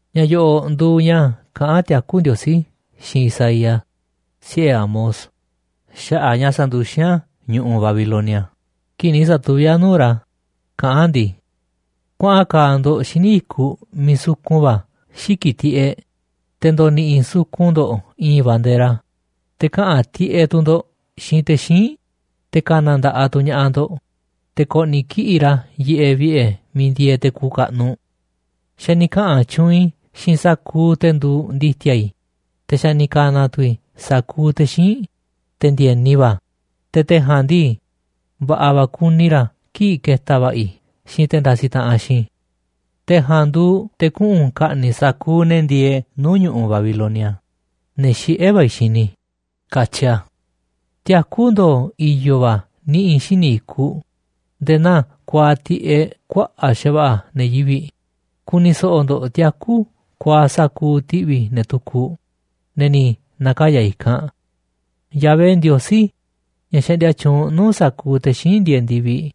Ña̱ yo̱ꞌo̱ꞌ nduuꞌ ña̱ kaꞌán tiakú Ndiosí xiinꞌ Isaías, siꞌe̱ Amoz, xaꞌa̱ꞌ ña̱ sa̱nduxín a̱ ñu̱ꞌuꞌ Babilonia kii̱ꞌ ni̱ sa̱tuví a̱ nuu̱ꞌ ra̱, kaꞌán a̱ ndii: “Kuaꞌan ka̱a̱ ndo̱ꞌ xíniꞌ i̱kuꞌ miiꞌ sukun va̱ xiki̱ꞌ tiꞌeꞌ, te̱ ndo̱ni̱ꞌi̱ sukun ndo̱ꞌ i̱i̱n bandera, te̱ kaꞌa̱n tiꞌeꞌ tu̱ ndo̱ꞌ xiinꞌ te̱ xíinꞌ, te̱ ka̱na̱ nda̱ꞌaꞌ tu̱ ña̱ꞌaꞌ ndo̱ꞌ, te̱ ko̱ꞌni̱ kiꞌi̱ꞌ ra̱ yiꞌeꞌ vi̱ꞌe̱ miiꞌ ndieeꞌ te̱ kuuꞌ kaꞌnuꞌ. Xa̱ ni̱ kaꞌa̱n tyuunꞌ i̱ xiinꞌ sa̱kuuꞌ te̱ nduuꞌ ndi̱ti̱a̱ i̱, te̱ xa̱ ni̱ ka̱na̱ tu̱ i̱ sa̱kuuꞌ te̱ xíinꞌ, te̱ ndi̱e̱ni va̱, te̱ te̱ ja̱a̱nꞌ ndii, va̱ꞌa̱ va̱ ku̱ni̱ ra̱ kii̱ꞌ ketaꞌ va̱ꞌa̱ i̱ xiinꞌ te̱ ndasiꞌ taꞌanꞌ xiinꞌ i̱. Te̱ ja̱a̱nꞌ nduuꞌ te̱ kuꞌu̱n ka̱ꞌni̱ꞌ sa̱kuuꞌ ne̱ ndieeꞌ nuu̱ꞌ ñu̱ꞌuꞌ Babilonia, ne̱ xiꞌé va̱ i̱ xini i̱”, katyi a̱. Tiakú ndo̱o̱ i̱yo̱ va̱ niꞌi̱ xíniꞌ i̱kuꞌ nde̱e̱ naa kuaaꞌ tiꞌeꞌ kuaꞌa̱ꞌ xa̱va̱ꞌa̱ ne̱ yivi̱ꞌ. Ku̱ni̱ so̱ꞌo̱ ndo̱ꞌ tiakú kuaaꞌ sa̱kuuꞌ ti̱ꞌvi̱ ne̱ tukuꞌ, ne̱ ni̱ na̱kaya̱ i̱kanꞌ. Yahvé Ndiosí, ña̱ xaꞌndia tyuunꞌ nuu̱ꞌ sa̱kuuꞌ te̱ xíinꞌ ndieeꞌ ndi̱viꞌ,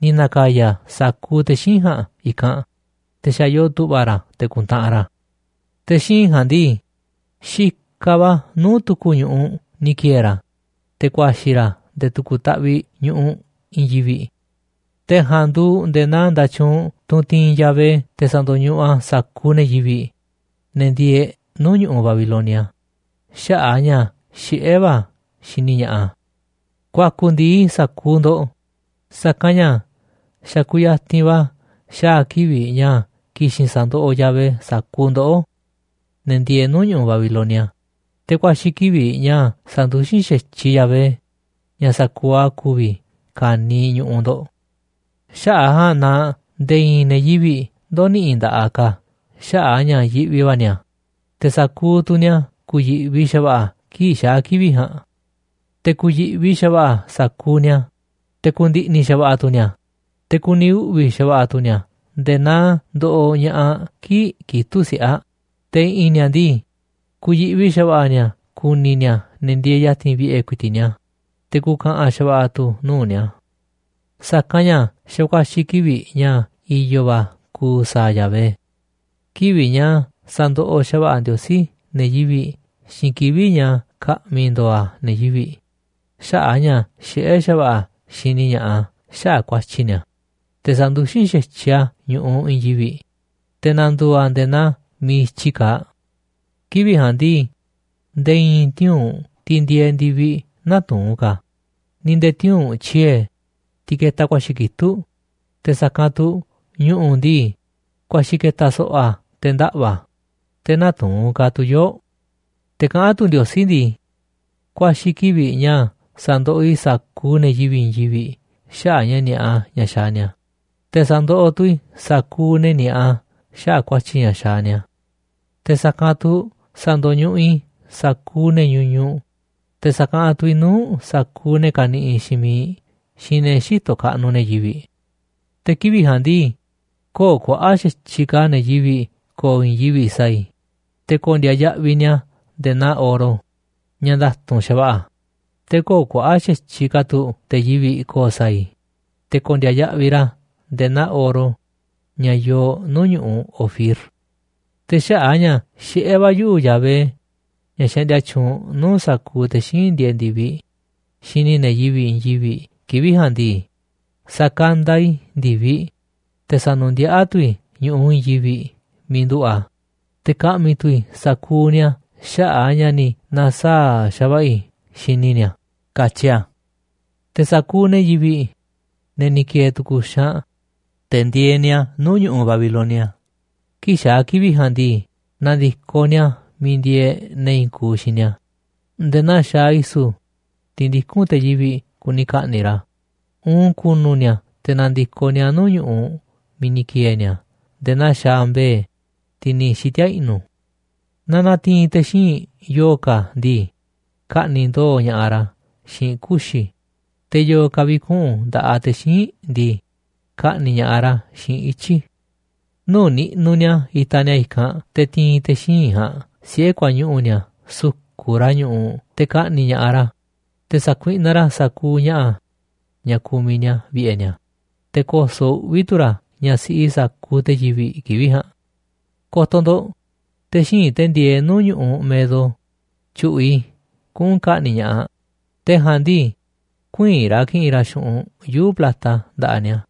ni̱ na̱ka̱ya̱ a̱ sa̱kuuꞌ te̱ xíinꞌ ja̱a̱nꞌ i̱kanꞌ, te̱ xa̱ yoo tu̱ꞌva̱ ra̱ te̱ ku̱ntaꞌanꞌ ra̱. Te̱ xíinꞌ ja̱a̱nꞌ ndii, xikaꞌ va̱ nuu̱ꞌ tu̱ku̱ ñu̱ꞌuꞌ ni̱ ki̱e̱e̱ ra̱, te̱ ku̱a̱xi̱ ra̱ nde̱e̱ tu̱ku̱ taꞌviꞌ ñu̱ꞌuꞌ i̱i̱n yivi̱ꞌ. Te̱ ja̱a̱nꞌ nduuꞌ nde̱e̱ naa nda̱tyuunꞌ, tunꞌ tiinꞌ Yahvé te̱ sa̱ndo̱ñuꞌuꞌ a̱ sa̱kuuꞌ ne̱ yivi̱ꞌ, ne̱ ndieeꞌ nuu̱ꞌ ñu̱ꞌuꞌ Babilonia, xaꞌa̱ꞌ a̱ ña̱ xiꞌé va̱ a̱ xini ña̱ꞌaꞌ a̱. Ku̱a̱ku̱ ndi̱i sa̱kuuꞌ ndo̱ꞌ, sa̱kanꞌ ña̱ xa̱ kuyatinꞌ va̱ xaa̱ kivi̱ꞌ ña̱ ki̱xi̱n sa̱ndoꞌoꞌ Yahvé sa̱kuuꞌ ndoꞌó, ne̱ ndieeꞌ nuu̱ꞌ ñu̱ꞌuꞌ Babilonia, te̱ ku̱a̱xi̱ kivi̱ꞌ ña̱ sa̱nduxín xa̱tyiꞌ Yahvé, ña̱ sa̱kuuꞌ a̱ ku̱vi̱, ka̱niiꞌ ñu̱ꞌuꞌ ndo̱ꞌ. Xaꞌa̱ꞌ a̱ ja̱a̱nꞌ na nde̱e̱ i̱i̱n ne̱ yivi̱ꞌ ndö̱ni̱ꞌi̱ nda̱ꞌaꞌ ka̱ xaꞌa̱ꞌ a̱ ña̱ yiꞌvi va̱ ni̱a̱, te̱ sa̱kuuꞌ tu̱ ni̱a̱ ku̱yi̱ꞌvi xa̱va̱ꞌa̱ kii̱ꞌ xaa̱ kivi̱ꞌ ja̱a̱nꞌ. Te̱ ku̱yi̱ꞌvi xa̱va̱ꞌa̱ sa̱kuuꞌ ni̱a̱, te̱ ku̱ndi̱ꞌni̱ xa̱va̱ꞌa̱ tu̱ ni̱a̱, te̱ ku̱ni̱ uꞌvi̱ xa̱va̱ꞌa̱ tu̱ ni̱a̱ nde̱e̱ naa ndoꞌoꞌ ña̱ꞌaꞌ kii̱ꞌ kitúꞌ siꞌe̱ aꞌ, te̱ i̱ꞌi̱n ni̱a̱ ndii, ku̱yi̱ꞌvi xa̱va̱ꞌa̱ ni̱a̱ ku̱ni̱ ni̱a̱ ne̱ ndieeꞌ ya̱ti̱n vi̱ꞌe̱ ku̱i̱ti̱ꞌ ni̱a̱, te̱ ku̱ka̱ꞌa̱n xa̱va̱ꞌa̱ tu̱ nuu̱ꞌ ni̱a̱. Sa̱kanꞌ ña̱ xa̱ ku̱a̱xi̱ kivi̱ꞌ ña̱ i̱yo̱ va̱ ku̱u̱ sa̱a̱ Yahvé, kivi̱ꞌ ña̱ sa̱ndoꞌoꞌ xa̱va̱ꞌa̱ Ndiosí ne̱ yivi̱ꞌ xiinꞌ kivi̱ꞌ ña̱ ka̱ꞌmi̱ ndo̱o̱ a̱ ne̱ yivi̱ꞌ xaꞌa̱ꞌ a̱ ña̱ xiꞌé xa̱va̱ꞌa̱ a̱ xini ña̱ꞌaꞌ a̱ xaꞌa̱ꞌ ku̱a̱tyi̱ ni̱a̱, te̱ sa̱nduxín xa̱tyiꞌ a̱ ñu̱ꞌuꞌ i̱i̱n yivi̱ꞌ, te̱ na̱ndu̱u̱ a̱ nde̱e̱ naa miiꞌ i̱tyi kaaꞌ. Kivi̱ꞌ ja̱a̱nꞌ ndii, nde̱e̱ i̱i̱n tiuu̱nꞌ, tiꞌ ndieeꞌ ndi̱viꞌ, nä̱tuu̱n ka̱, ni̱ nde̱e̱ tiuu̱nꞌ tyiee̱, tiꞌ ketaꞌ ku̱a̱xi̱ kitúꞌ, te̱ sa̱kanꞌ tu̱ ñu̱ꞌu̱ ndii, ku̱a̱xi̱ ke̱ta̱ so̱ꞌo̱ a̱ te̱ ndaꞌva̱ a̱, te̱ nä̱tuu̱n ka̱ tu̱ yoo̱ꞌ. Te̱ kaꞌán tu̱ Ndiosí ndii: “Ku̱a̱xi̱ kivi̱ꞌ ña̱ sa̱ndoꞌoꞌ i̱ sa̱kuuꞌ ne̱ yivi̱ꞌ i̱i̱n yivi̱ꞌ xaꞌa̱ꞌ ña̱ ni̱a̱ꞌa ña̱ xaaꞌ ni̱a̱, te̱ sa̱ndoꞌoꞌ tu̱ i̱ sa̱kuuꞌ ne̱ ni̱a̱ꞌa xaꞌa̱ꞌ ku̱a̱tyi̱ ña̱ xaaꞌ ni̱a̱. Te̱ sa̱kanꞌ tu̱ sa̱ndo̱ñuꞌuꞌ i̱ sa̱kuuꞌ ne̱ ñuñuꞌ, te̱ sa̱kaꞌanꞌ tu̱ i̱ nuu̱ꞌ sa̱kuuꞌ ne̱ kaniꞌiꞌ xiinꞌ miiꞌ xiinꞌ ne̱ xïtoꞌ kaꞌnuꞌ ne̱ yivi̱ꞌ. Te̱ kivi̱ꞌ ja̱a̱nꞌ ndii, köo̱ꞌ kuaꞌa̱ꞌ xa̱tyiꞌ ka̱ ne̱ yivi̱ꞌ ko̱o̱ i̱i̱n yivi̱ꞌ sa̱a̱ i̱, te̱ ko̱ndi̱a̱ yaꞌviꞌ ni̱a̱ nde̱e̱ naa oro ña̱ nda̱tu̱nꞌ xa̱va̱ꞌa̱, te̱ köo̱ꞌ kuaꞌa̱ꞌ xa̱tyiꞌ ka̱ tu̱ te̱ yivi̱ꞌ ko̱o̱ sa̱a̱ i̱, te̱ ko̱ndi̱a̱ yaꞌviꞌ ra̱ nde̱e̱ naa oro ña̱ yoo nuu̱ꞌ ñu̱ꞌuꞌ Ofir. Te̱ xaꞌa̱ꞌ a̱ ña̱ xiꞌé va̱ yuꞌu̱, Yahvé, ña̱ xaꞌndia tyuunꞌ nuu̱ꞌ sa̱kuuꞌ te̱ xíinꞌ ndieeꞌ ndi̱viꞌ, xini i̱ ne̱ yivi̱ꞌ i̱i̱n yivi̱ꞌ kivi̱ꞌ ja̱a̱nꞌ ndii, sa̱kanda i̱ ndi̱viꞌ, te̱ sa̱nu̱ndiaꞌá tu̱ i̱ ñu̱ꞌuꞌ i̱i̱n yivi̱ꞌ miiꞌ nduꞌu̱ꞌ a̱, te̱ ka̱ꞌmi̱ tu̱ i̱ sa̱kuuꞌ ni̱a̱ xaꞌa̱ꞌ a̱ ña̱ ni̱ na̱saa̱ꞌ xa̱va̱ꞌa̱ i̱ xini i̱ ni̱a̱”, katyi a̱. Te̱ sa̱kuuꞌ ne̱ yivi̱ꞌ, ne̱ ni̱ ki̱e̱e̱ tu̱ku̱ xaanꞌ, te̱ ndieeꞌ ni̱a̱ nuu̱ꞌ ñu̱ꞌuꞌ Babilonia kii̱ꞌ xaa̱ kivi̱ꞌ ja̱a̱nꞌ ndii, na̱ndi̱koꞌ ni̱a̱ miiꞌ ndieeꞌ ne̱ i̱i̱n kuuꞌ xiinꞌ ni̱a̱ nde̱e̱ naa xaaꞌ i̱su̱, tiꞌ ndikún te̱ yivi̱ꞌ kuni ka̱ꞌni̱ꞌ ra̱, uun ku̱nu̱ ni̱a̱ te̱ na̱ndi̱koꞌ ni̱a̱ nuu̱ꞌ ñu̱ꞌuꞌ miiꞌ ni̱ ki̱e̱e̱ ni̱a̱ nde̱e̱ naa xaaꞌ mbe̱e̱, tiꞌ ni̱ xiti̱a̱ i̱ꞌnu̱. Naaꞌ na̱ti̱i̱n te̱ xíinꞌ yo̱o̱ ka̱ ndii, ka̱ꞌni̱ꞌ ndo̱o̱ ña̱ꞌaꞌ ra̱ xiinꞌ kuxi̱, te̱ yo̱o̱ ka̱ vi̱kuꞌu̱n nda̱ꞌaꞌ te̱ xíinꞌ ndii, ka̱ꞌni̱ꞌ ña̱ꞌaꞌ ra̱ xiinꞌ ityi̱. Nuu̱ꞌ niꞌnuꞌ ni̱a̱ itaꞌ ni̱a̱ i̱kanꞌ te̱ ti̱i̱n te̱ xíinꞌ ja̱a̱nꞌ siꞌe̱ kuañuꞌu̱ ni̱a̱ su̱ku̱ꞌ ra̱ ñu̱ꞌuꞌ te̱ ka̱ꞌni̱ꞌ ña̱ꞌaꞌ ra̱, te̱ sa̱kuiꞌnaꞌ ra̱ sa̱kuuꞌ ña̱ꞌa̱ ña̱ kumiꞌ ni̱a̱ vi̱ꞌe̱ ni̱a̱, te̱ ko̱so̱ꞌ uꞌvi̱ va̱ tu̱ ra̱ ñaꞌ siꞌi sa̱kuuꞌ te̱ yivi̱ꞌ kivi̱ꞌ ja̱a̱nꞌ. “Ko̱to̱ ndo̱ꞌ, te̱ xíinꞌ, te̱ ndieeꞌ nuu̱ꞌ ñu̱ꞌuꞌ Medo, tyu̱ꞌu̱ꞌ i̱ kuꞌu̱n ka̱ꞌni̱ꞌ ña̱ꞌaꞌ, te̱ ja̱a̱nꞌ ndii, ku̱ï̱i̱n ra̱ ki̱ꞌi̱n ra̱ xu̱ꞌunꞌ yuu̱ꞌ plata nda̱ꞌaꞌ ni̱a̱,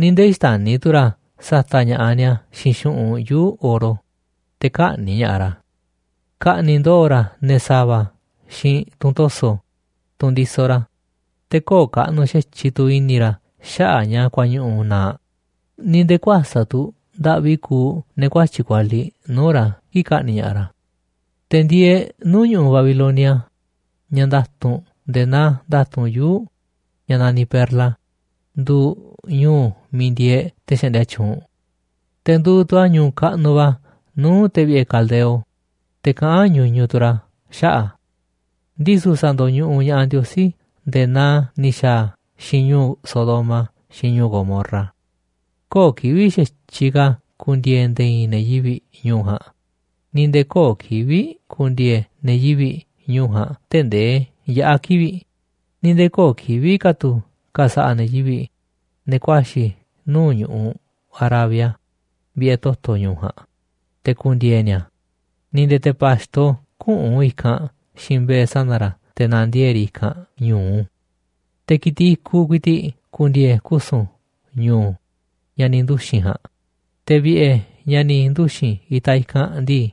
ni̱ nde̱e̱ xtäni̱ tu̱ ra̱ sa̱ta̱ꞌ ña̱ꞌaꞌ ni̱a̱ xiinꞌ xu̱ꞌunꞌ yuu̱ꞌ oro, te̱ kä̱ꞌni̱ꞌ ña̱ꞌaꞌ ra̱. Ka̱ꞌni̱ꞌ ndo̱o̱ ra̱ ne̱ sa̱va̱ xiinꞌ tunꞌ to̱so̱, tunꞌ ndisoꞌ ra̱, te̱ köo̱ꞌ kaꞌnuꞌ xa̱tyiꞌ tu̱ i̱ni̱ ra̱ xaꞌa̱ꞌ ña̱ kuañuꞌu̱ na̱a̱ꞌ, ni̱ nde̱e̱ kuäsa̱ꞌ tu̱ ndaꞌvi kuuꞌ ne̱ kuatyi̱ꞌ kualiꞌ nuu̱ꞌ ra̱ kii̱ꞌ ka̱ꞌni̱ꞌ ña̱ꞌaꞌ ra̱.” Te̱ ndieeꞌ nuu̱ꞌ ñu̱ꞌuꞌ Babilonia, ña̱ nda̱tu̱nꞌ nde̱e̱ naa nda̱tu̱nꞌ yuu̱ ña̱ naniꞌ perla, nduuꞌ ñu̱u̱ miiꞌ ndieeꞌ te̱ xaꞌndia tyuunꞌ. Te̱ nduuꞌ tu̱ a̱ ñu̱u̱ kaꞌnuꞌ va̱ nuu̱ꞌ te̱ vi̱ꞌe̱ Caldeo, te̱ kaꞌán ñuñuꞌ tu̱ ra̱ xaꞌa̱ꞌ a̱. Ndisu̱ sa̱ndo̱ñuꞌuꞌ ña̱ꞌaꞌ Ndiosí nde̱e̱ naa ni̱ xa̱a̱ a̱ xiinꞌ ñu̱u̱ Sodoma xiinꞌ ñu̱u̱ Gomorra. Köo̱ꞌ kivi̱ꞌ xa̱tyiꞌ ka̱ ku̱ndi̱e̱e̱ nde̱e̱ i̱i̱n ne̱ yivi̱ꞌ ñu̱u̱ ja̱a̱nꞌ, ni̱ nde̱e̱ köo̱ꞌ kivi̱ꞌ ku̱ndi̱e̱e̱ ne̱ yivi̱ꞌ ñu̱u̱ ja̱a̱nꞌ tee̱ꞌ ndee yaꞌa̱ kivi̱ꞌ. Ni̱ nde̱e̱ köo̱ꞌ kivi̱ꞌ ka̱ tu̱ ka̱sa̱ꞌa̱ ne̱ yivi̱ꞌ, ne̱ ku̱a̱xi̱ nuu̱ꞌ ñu̱ꞌuꞌ Arabia, vi̱ꞌe̱ toto̱ ñu̱u̱ ja̱a̱nꞌ, te̱ ku̱ndi̱e̱e̱ ni̱a̱. Ni̱ nde̱e̱ te̱ pa̱xto küꞌu̱n i̱kanꞌ xiinꞌ mbe̱e̱ sana̱ ra̱ te̱ na̱ndiee̱ꞌ riꞌ i̱kanꞌ ñu̱u. Te̱ ki̱tiꞌ i̱kuꞌ ku̱i̱ti̱ꞌ ku̱ndi̱e̱e̱ kusu̱n ñu̱u̱ ña̱ ni̱ nduxi̱n ja̱a̱nꞌ, te̱ vi̱ꞌe̱ ña̱ ni̱ nduxi̱n itaꞌ i̱kanꞌ ndii,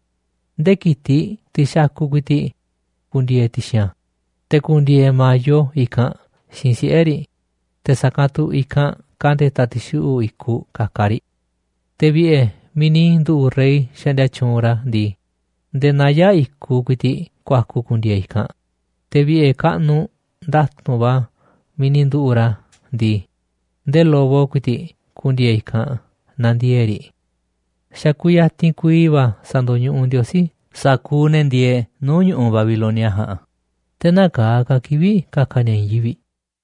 ndee ki̱tiꞌ, tiꞌ xakuꞌ ku̱i̱ti̱ꞌ, ku̱ndi̱e̱e̱ ti̱xi̱n a̱. Te̱ ku̱ndi̱e̱e̱ ma̱yo i̱kanꞌ xiinꞌ siꞌe̱ riꞌ, te̱ sa̱kanꞌ tu̱ i̱kanꞌ ka̱nde̱ta̱ ti̱xuꞌu̱ꞌ i̱kuꞌ ka̱ka̱ riꞌ. Te̱ vi̱ꞌe̱ miiꞌ ni̱ nduꞌu̱ꞌ rey xaꞌndia tyuunꞌ ra̱ ndii, nde̱e̱ naya̱ꞌ i̱kuꞌ ku̱i̱ti̱ꞌ ku̱a̱ku̱ ku̱ndi̱e̱e̱ i̱kanꞌ. Te̱ vi̱ꞌe̱ kaꞌnuꞌ nda̱tu̱nꞌ va̱ miiꞌ ni̱ nduꞌu̱ꞌ ra̱ ndii, ndee lobo ku̱i̱ti̱ꞌ ku̱ndi̱e̱e̱ i̱kanꞌ na̱ndiee̱ꞌ riꞌ. Xa̱ kuyatinꞌ kuiiꞌ va̱ sa̱ndo̱ñuꞌuꞌ Ndiosí sa̱kuuꞌ ne̱ ndieeꞌ nuu̱ꞌ ñu̱ꞌuꞌ Babilonia ja̱a̱nꞌ, te̱ nä̱kaa̱ ka̱ kivi̱ꞌ ka̱ka̱ ni̱a̱ i̱i̱n yivi̱ꞌ.